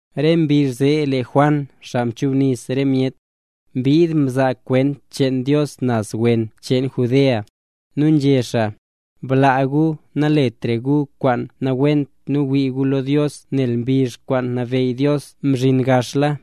Re mbizh zee lee Juan Xaa Nchubnis re myet, mbid mzaa kwent cheen Dios naz wen cheen Judea. Nu nzhé xaa: —¡Blaa gu naletra gu kwaan nawent nu wii gu lo Dios nel mbizh kwaan nabeyy Dios mzhin gaxla!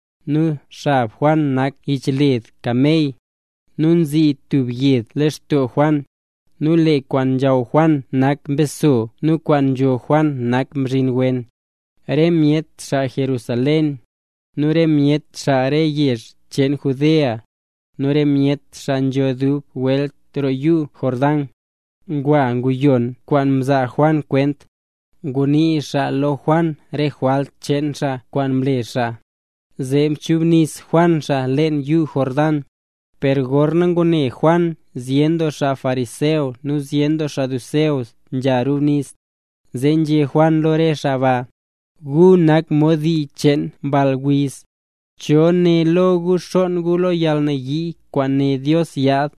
Nu xab Juan nak yichled kamey, nu nzii tub yed lextoo Juan. Nu lee kwaan nzhaw Juan nak mbeso nu kwaan nzho Juan nak mzhin wen. Re myet xaa Jerusalén, nu re myet xaa re yezh cheen Judea, nu re myet xaa nzho dub welt roo yuu Jordán, ngwa nguyon kwaan mzaa Juan kwent. Ngunii xaa lo Juan re jwalt cheen xaa kwaan mle xaa, zee mchubnis Juan xaa leen yuu Jordán. Per gorna ngune Juan zyen doo xaa fariseo nu xaa saduceo nzha rubnis, zee nzhé Juan lo re xaa ba: —¡Gu nak mod dii cheen mball wiz! ¿Cho né lo re gu xonn gu lo yalnayii kwaan né Dios yaad?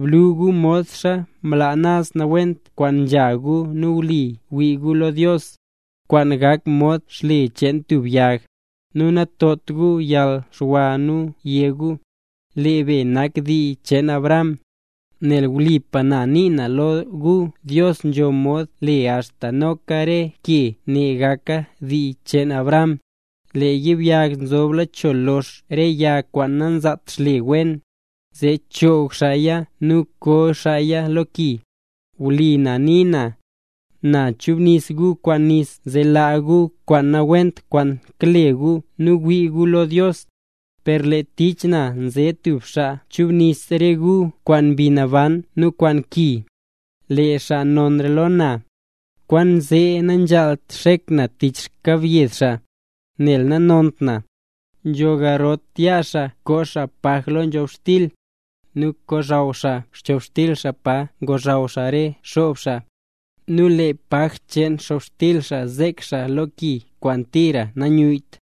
Blu gu mod xaa mlaa naz nawent kwaan nzha gu nu wlipa wii gu lo Dios, kwaan gak mod xle cheen tub yag. Nu natot gu yalxwa nu yé gu: “Lee be nak dii cheen Abraham”; nel wlipa na nii na lo gu, Dios nzho mod le axta noka re ke ne gaka dii cheen Abraham. Lee yibyag nzobla cho lox re yag kwaan nanzaat xle wen, zee choog xaaya nu koo xaaya lo ki. Wlipa na nii na, na nchubnis re gu kwaan nis zee laa gu kwaan nawent kwaan kale gu nu wii gu lo Dios, per lee tich na nze stub xaa chubnis re gu kwaan Mbi Naban nu kwaan ki. Lee xaa nonra lo na, kwaanzee nanzhaalt xek na tich xkyelyed xaa, nel nanont na. Nzho garot yaa xaa koo paj lo nzhobxtil, nu kozhaw xaa nzhobxtil pa ngozhaw xaa re xob xaa, nu lee paj cheen nzhobxtil zek xaa lo ki kwaan tira nanyuyyt.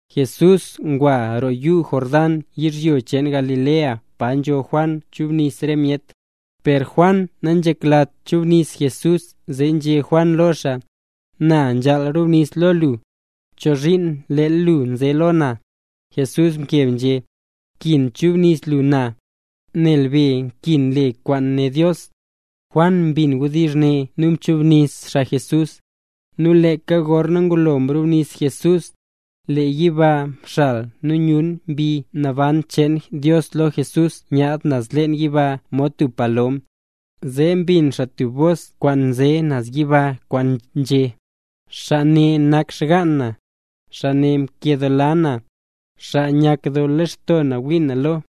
Jesús ngwa roo yuu Jordán yizhyo cheen Galilea pa nzo Juan kachubnis re myet. Per Juan nanzheklat chubnis Jesús zee nzhé Juan lo xaa: —Na nzhaal rubnis lo lu, ¿chozhiin leel lu nze lo na? Jesús mkeb nzhé: —Nkin chubnis lu na, nel be nkin le kwaan né Dios. Juan mbin wdizh ne nu mchubnis xaa Jesús. Nu leeka gorna ngulo mrubnis Jesús, lee yiba mxal nu myun Mbi Naban cheen Dios lo Jesús nyaadla naz leen yiba mod tub palom. Zee mbin xaa tub bos kwaan nze naz yiba kwaan nzhé: —Xaa ne nak xgaan na, xaa nkedoola na, xaa nyakdoo lextoo na wii na lo.